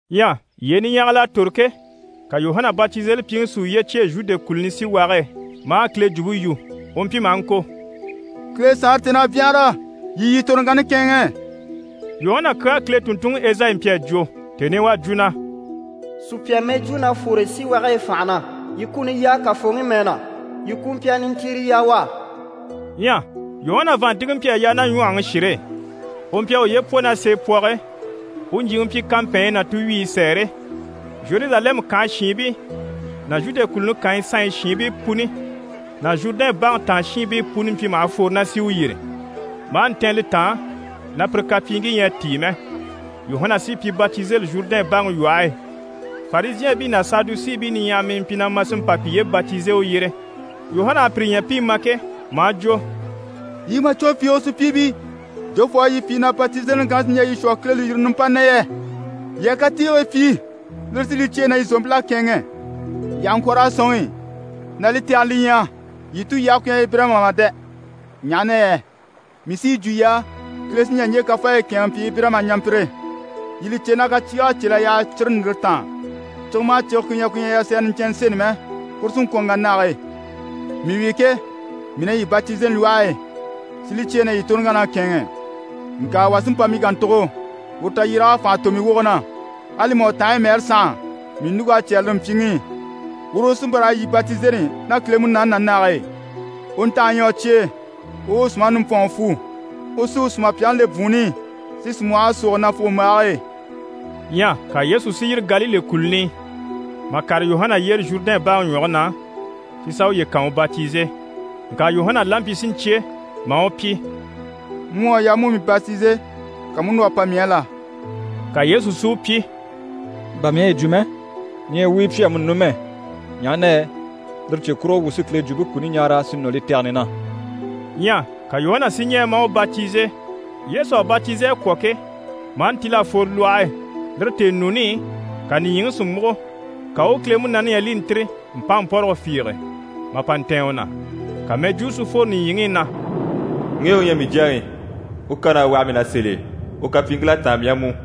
Ɲyɛ yyee niɲyahagil'à tòro ke, ka Yuhana Batizelipyiŋi si uye cyêe Zhude kùluni síwage e maa Kile jwumpe yu. U mpyi maha ŋko: «Kile Saanre tèn'à byanhara, yii yii toroŋkanni kɛ̂ɛnŋɛ.» Yuhana kyaa Kile tùnntunŋi Ezayi mpyi a jwo, tèni i u à jwo na: «Sùpya mɛjwuu na fwore síwage e fànha na “Yii kuni yaa Kafooŋi mɛɛ na, yii kumpyɛrɛ nintiire yaa u á.”» Ɲyɛ Yuhana vàanntinŋke mpyi a yaa ná ɲwɔhɔŋi shire e, u mpyi a uye pwɔ ná seepwɔge e. U ɲjyìŋi mpyi kampɛɛnɲyi ná tuwyiyi sɛɛre. Zheruzalɛmu kànhe shiinbii ná Zhude kùluni kànyi sanɲyi shiinbii puni ná Zhurudɛn baŋi taan shiinbii puni mpyi maha fwore na sì u yyére. Maa ntɛ̀n li taan na pire kapyiiŋkii ɲyɛ a tíi mɛ, Yuhana sí i pi batizeli Zhurudɛn baŋi lwɔhe e. Farizhɛɛnbii ná Sadusiibii niɲyahara mpyi na ma si mpa piye batize u yyére. Yuhana à pire ɲya pi i ma ke, maa jwo: «Yii màcwɔn fiige sùpyiibii, jofoo u à yii pyi na batizeliŋi kanni sí n‑jà yii shwɔ Kile lùyirini nimpani na yɛ? Yii a katiigii pyi, lire sí li cyêe na yii zòompil'à kɛ̂ɛnŋɛ. Yii àha ŋkwɔ̀ raa sɔ̂nŋi na li tɛgɛni li ɲyɛ yii tulyage ku ɲyɛ Ibirayima mà dɛ! Ɲaha na yɛ mii sí yi jwo yii á, Kile sí n‑jà ɲje kafaayi kɛ̂ɛnŋɛ n‑pyi Ibirayima ɲampyire. Yii li cè na kaciig'à cél'a yaha cire ndìre taan. Cige maha cige ku ɲyɛ ku ɲyɛ na yasɛrɛ niɲcɛnnɛ seni mɛ, kuru sí n‑kwɔ̀n n‑wà nage e. Mii wi ke, mii na yii batizeli lwɔhe e si li cyêe na yii toroŋkann'à kɛ̂ɛnŋɛ, ŋka wà sí n‑pa mii kàntugo, uru tayyéreg'à fànha tò mii woge na. Ali mà u tanhaɲyi mɛɛre sànha, mii ɲùŋk'à cyɛ́rɛ lire mpyiŋi i. Uru u sí n‑pa raa yii batizeli ná Kile Munaani ná nage e. U ntanhe ɲyɛ u cye e, u u u sùmaŋi nimbwɔnŋi fwu. U sí u sùmapyaŋi le bwùunni i, si sìmwɔhɔŋke súugo nafugombaage e.» Ɲyɛ ka Yesu si yîri Galile kùluni i, mà kàre Yuhana yyére Zhurudɛn baŋi ɲwɔge na, si sà uye kan u batize. Ŋka Yuhana la mpyi si ɲcyé maa u pyi: «Mu u à yaa mu u mii batize, ka mu u núr'a pa mii á la?» Ka Yesu si u pyi: «Bà mii à yi jwo mɛ, ɲɛɛ wuu u yi pyi amuni numɛ, ɲaha na yɛ lire cye kurugo wuu sí Kile jwumpe kuni ɲaara si nɔ li tɛgɛni na.» Ɲyɛ ka Yuhana si ɲɛɛ maa u batize. Yesu à batize a kwɔ̀ ke, maa ntíl'a fworo lwɔhe e. Lire tèenuuni i, ka nìɲyiŋi si múgo. Ka u u Kile Munaani ɲya li i ntîri mpánmpɔrɔgɔ fiige, mà pa ntɛ̀ɛn u na, ka mɛjwuu si fworo nìɲyiŋi i na: «Ŋge u ɲyɛ mii Jyaŋi, u kan'à waha mii na sèl'e, u kapyiiŋkil'à táan mii á mú.»